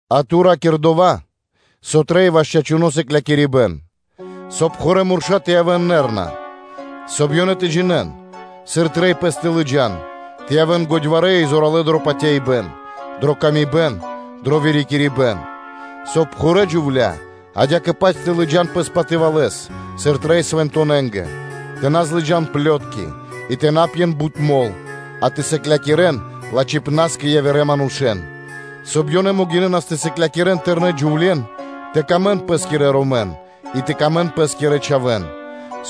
А ту ра́кир дова́, со трэй ваш чачуно́ сыклякирибэ́н; соб (кай) пхурэ́ мурша́ тэ явэ́н ракхунэ, соб (кай) ёнэ тэ джинэ́н, сыр трэй пэс тэ лыджа́н, тэ явэ́н годьварэ́ и зоралэ́ дро патяибэ́н, дрэ паты́в кэ яви́р мануша́, дро вырикирибэн; соб (кай) пхурэ́ джувля́ адя́кэ-паць тэ ладжан пэс патывалэс, сыр трэй свэнтонэнгэ, тэ на злыджан плётки, и тэ на пьен бут мол, а тэ сыклякирэ́н лачхипнаскэ явирэ манушэ́н; соб (кай) ёнэ могинэ́нас тэ сыклякирэ́н тэрнэ́ джувле́н тэ сыкавэ́н паты́в пэ́скирэ ромэнгэ, и тэ сыкавэ́н паты́в пэ́скирэ чхавэ́нгэ;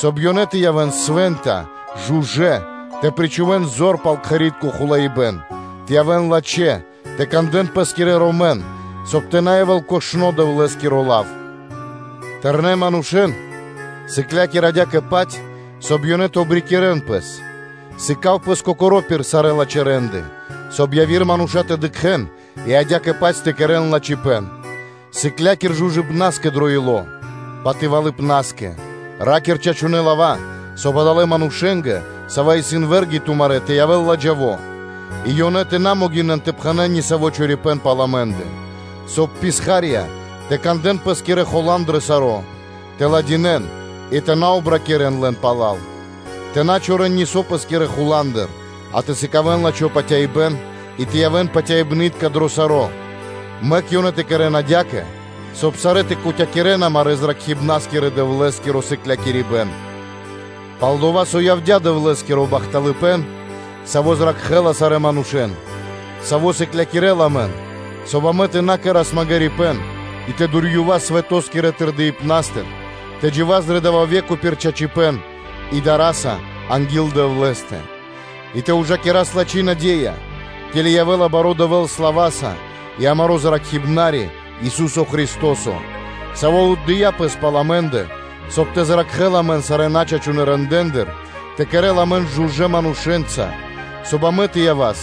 соб (кай) ёнэ тэ явэ́н свэ́нта, жужэ́, тэ рикирэ́н лачхэ́с кхэри́тко хулаибэн; тэ явэ́н лачхэ́, тэ кандэ́н пэ́скирэ ромэн, соб (кай) тэ на явэ́л кошно Дэвлэ́скиро лав. Тэрнэ́ манушэ́н сыкля́кир адя́кэ-паць, соб (кай) ёнэ тэ обрикирэн пэс: сыка́в пэс кокоро́ пир сарэ́ лачхэ́ рэ́нды, соб (кай) яви́р мануша́ тэ дыкхэ́н и адя́кэ-паць тэ кэрэ́н лачхипэ́н, сыкля́кир жужыпнаскэ дро ило́, патывалыпнаскэ; ра́кир чачунэ́ лава́, соб (кай) адалэ́ манушэ́нгэ, савэ́ исын вэ́рги тумарэ́, тэ явэ́л лэ́нгэ ладжаво, и ёнэ тэ на могинэн тэ пхэнэ́н нисаво́ чорипэ́н пал амэ́ндэ: соб (кай) писха́рья тэ кандэ́н пэ́скирэ хулан дро саро́, тэ кэрэ́н пир ило́ и тэ на обракирэн лэн пала́л; тэ на чорэн нисо́ пэ́скирэ хуландыр, а тэ сыкавэ́н лачхо́ патяибэ́н и тэ явэ́н патяибнытка дро саро́, мэк ёнэ тэ кэрэ́н адя́кэ, соб (кай) сарэ́ тэ кутякирэн амарэ́ Зракхибнарискирэ-Дэвлэ́скиро сыклякирибэ́н. Пал-дова́ со явдя́ Дэвлэ́скиро бахталыпэ́н, саво́ зракхэ́ла сарэ́ манушэ́н; саво́ сыклякирэ́ла амэн, соб (кай) амэ тэ на кэра́с магирипэ́н и тэ дурьёвас свэто́скирэ тырдыпнастыр, тэ джива́с дрэ дава́ ве́ко пир чачипэ́н и дара́са анги́л Дэвлэ́стэ, и тэ ужакирас лачхи́ наде́я, ке́ли явэ́ла баро́ Дэвэ́л слава́са и амаро́ Зракхибнари, Ису́со Христо́со, Саво́ отдыя́ Пэс пал амэ́ндэ, соб (кай) Ёв тэ зракхэ́л амэн сарэ́ начачунэ рэндэ́ндыр, тэ кэрэ́л амэн жужэ́ манушэ́нца, соб (кай) амэ тэ явас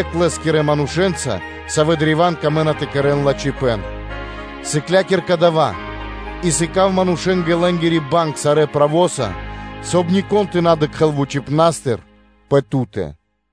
екх Лэ́скирэ манушэ́нца, савэ́ древа́н тырдэнапэ тэ кэрэ́н лачхипэ́н. Сыкля́кир дава́ и сыка́в манушэ́нгэ лэ́нгири банг сарэ́ правоса, соб (кай) нико́н тэ на дыкхэ́л вучипна́стыр пэ ту́тэ.